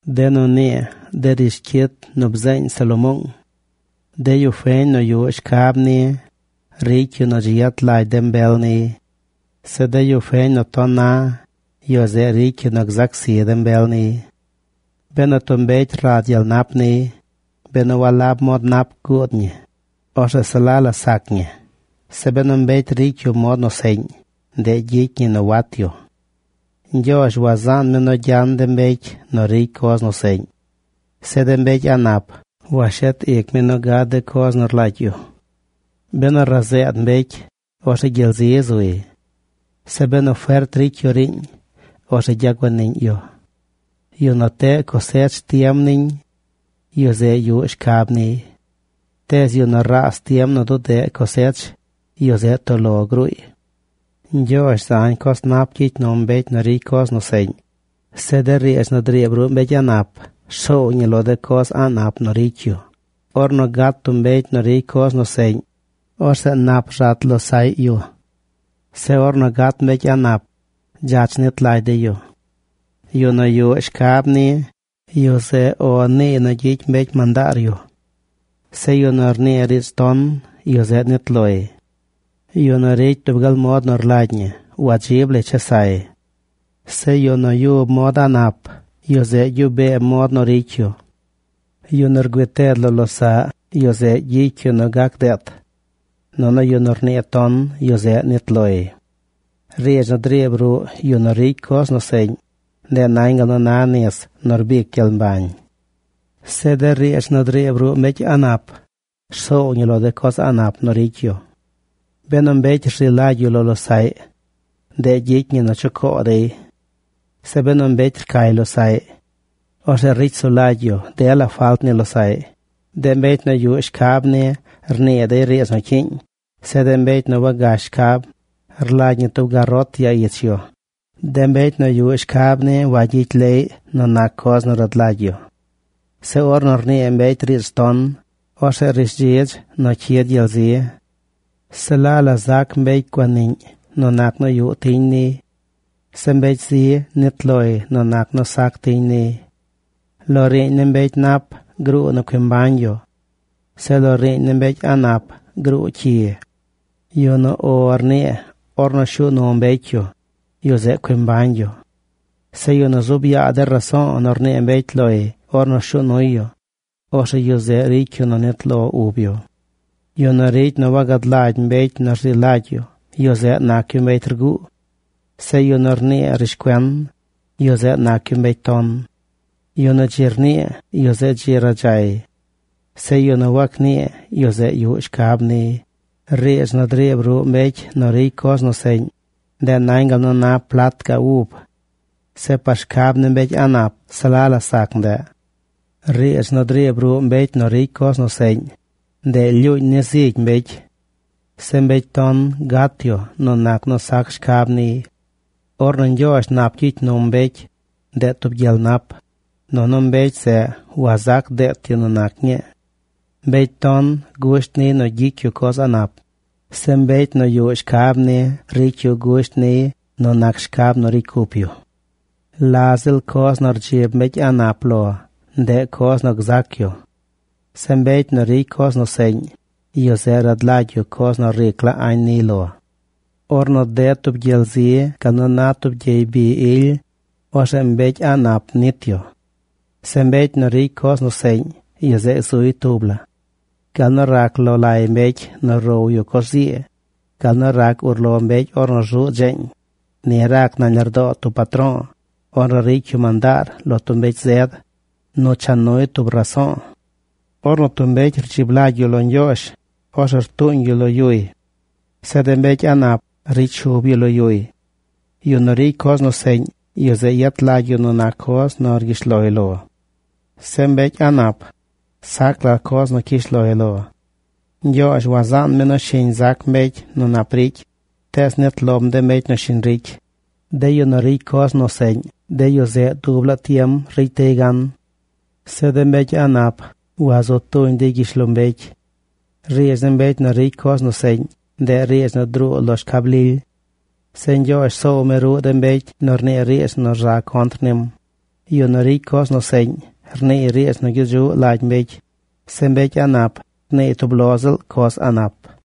De nu nii de rishcyit nu bzeeñ Salomoong. De yu feñ nu yuꞌ shcab ni ricy yu nu dzi yet lagy de mbel niy. Zeꞌ de yu feñ nu ton na, yu zeꞌ ricy yu nu gzac zi de mbel niy. Benu tub mbecy rad gyel nap niy, benu walab mod nap guud ñi, orzeꞌ se la la sac ñi. Zeꞌ benu mbecy ricy yu mod nu seꞌñ, ndeꞌ gyicy ñi nu wat yu. Ñgyoozh wazaan mi nu gyan de mbecy nu ricy coz nu seꞌñ. Zeꞌ de mbecy a̱ꞌ nap washet ic mi nu gad de coz nu rlagy yu. Benu razeed mbecy, orzeꞌ gyel zi zuy. Zeꞌ benu fert ricy yu riiñ, orzeꞌ gyaguaniꞌñ yu. Yu nu teꞌ cosech tiem niñ, yu zeꞌ yuꞌ shcab niy. Tees yu nu raas tiem nu dudeꞌ cosech, yu zeꞌ toꞌ lo gruuy. Ñgyoozh zañ coz nap gyicy num mbecy nu ricy coz nu seꞌñ. Zeꞌ de riidz nu driib ruꞌ mbecy a̱ꞌ nap rsoow ñi lo de coz a̱ꞌ nap nu ricy yu. Ornu gat tub mbecy nu ricy coz nu seꞌñ, orzeꞌ nap rzat losaꞌy yu. Zeꞌ ornu gat mbecy a̱ꞌ nap, dzach nit lagy dey yu. Yu nu yuꞌ shcab ni, yu zeꞌ “O”, niiy nu gyicy mbecy mandaar yu. Zeꞌ yu nu rnii riidz ton, yu zeꞌ nit loy. Yu nu ricy dub gal mod nu rlagy ñi wadzib lay chesay. Zeꞌ yu nu yub mod a̱ꞌ nap, yu zeꞌ gyuꞌ bee mod nu ricy yu. Yu nu rgüii ted lo losaꞌ, yu zeꞌ gyicy yu nu gac deet. Nunu yu nu rnii ton, yu zeꞌ nit loy. Riidz nu driib ruꞌ yu nu ricy coz nu seꞌñ, ndeꞌ nañ gal nu na nis nu rbic gyel mbañ. Zeꞌ de riidz nu driib ruꞌ mbecy a̱ꞌ nap rsoow ñi lo de coz a̱ꞌ nap nu ricy yu. Benu mbecy rzi lagy yu lo losaꞌy, ndeꞌ gyicy ñi nu chucoo dey. Zeꞌ benu mbecy rcay losaꞌy, orzeꞌ ricy sulagy yu dela falt ni losaꞌy. De mbecy nu yuꞌ shcab ni rnii dey riidz nu cyiiñ. Zeꞌ de mbecy nu wagash shcab rlagy ñi tub garot ya ich yu. De mbecy nu yuꞌ shcab ni wayicy leꞌy nu nac coz nu rad lagy yu. Zeꞌ ornu rnii mbecy riidz ton, orzeꞌ rishdzidz nu cyid gyel zi. Se la la zac mbecy guaniꞌñ nu nac nu yuꞌ tiñ niy. Zeꞌ mbecy zi nit loy nu nac nu sac tiñ niy. Lo riiñ ni mbecy nap gruu nu cui mbañ yu. Zeꞌ lo riiñ ni mbecy a̱ꞌ nap gruu cyi. Yu nu “O”, rnii ornu shuu nu mbecy yu, yu zeꞌ cui mbañ yu. Zeꞌ yu nu zuub yaa de raso̱o̱ nu rnii mbecy loy ornu shuu nuy yu, orzeꞌ yu zeꞌ ricy yu nu nit lo ub yu. Yu nu ricy nu wagad lagy mbecy nu rzi lagy yu, yu zeꞌ nac yu mbecy rguu. Zeꞌ yu nu rnii rishcuen, yu zeꞌ nac yu mbecy ton. Yu nu dzi rnii, yu zeꞌ dzi radzay. Zeꞌ yu nu wagnii, yu zeꞌ yuꞌ shcab niy. Riidz nu driib ruꞌ mbecy nu ricy coz seꞌñ, ndeꞌ nañ gal nu na plat ga ub. Zeꞌ par shcab ni mbecy a̱ꞌ nap, se la la sac ndeꞌ. Riidz nu driib ruꞌ mbecy nu ricy coz seꞌñ, ndeꞌ lyuuñ ni zigy mbecy. Zeꞌ mbecy ton gat yu nu nac nu sac shcab niy. Ornu Ñgyoozh nap gyicy num mbecy, ndeꞌ tub gyel nap, nunu mbecy zeꞌ wazac deet yu nu nac ñii. Mbecy ton gusht niy nu gyicy yu coz a̱ꞌ nap. Zeꞌ mbecy nu yuꞌ shcab ni ricy yu gusht niy nu shcab nu ricy cup yu. La ziꞌl coz nu rdzib mbecy a̱ꞌ nap lo, ndeꞌ coz nu gzac yu. Zeꞌ mbecy nu ricy coz nu seꞌñ, yu zeꞌ rad la coz nu ric la añ niy lo. Ornu ded tub gyel zi gal nu na tub gyey bi ily, orzeꞌ mbecy a̱ꞌ nap nit yu. Zeꞌ mbecy nu ricy coz nu seꞌñ, yu zeꞌ zuy tub la. Gal nu rac lo lay mbecy nu row yu coz zii, gal nu rac urlo mbecy ornu rzuꞌ dzeeñ, ni rac nañ lardoo tub patro̱o̱ ornu ricy yu mandaar lo tub mbecy zed nu cha nuy tub raso̱o̱. Ornu tub mbecy rdzib lagy yu lo Ñgyoozh, orzeꞌ rtuuñ yu lo yuy. Zeꞌ de mbecy a̱ꞌ nap ricy shub yu lo yuy. Yu nu ricy coz seꞌñ, yu zeꞌ yet lagy yu nu nac coz nu rgyish loy lo. Zeꞌ mbecy a̱ꞌ nap, sac la coz nu cyish loy lo. Ñgyoozh wazaan mi nu shiñ zac mbecy nu nap ricy, tees nit lom de mbecy nu shiñ ricy. De yu nu ricy coz nu seꞌñ, de yu zeꞌ dub laa tiem ricy dey gan. Zeꞌ de mbecy a̱ꞌ nap wazu tuñ dey gyishlombecy. Riidz ni mbecy nu ricy coz nu seꞌñ, ndeꞌ riidz nu druu lo shcab lily. Zeꞌ Ñgyoozh soow mi ruꞌ de mbecy nu rnii riidz nu rza contr nim. Yu nu ricy coz nu seꞌñ, rniiy riidz nu gyedzuꞌ lagy mbecy. Zeꞌ mbecy a̱ꞌ nap rniiy tub lo ziꞌl coz a̱ꞌ nap.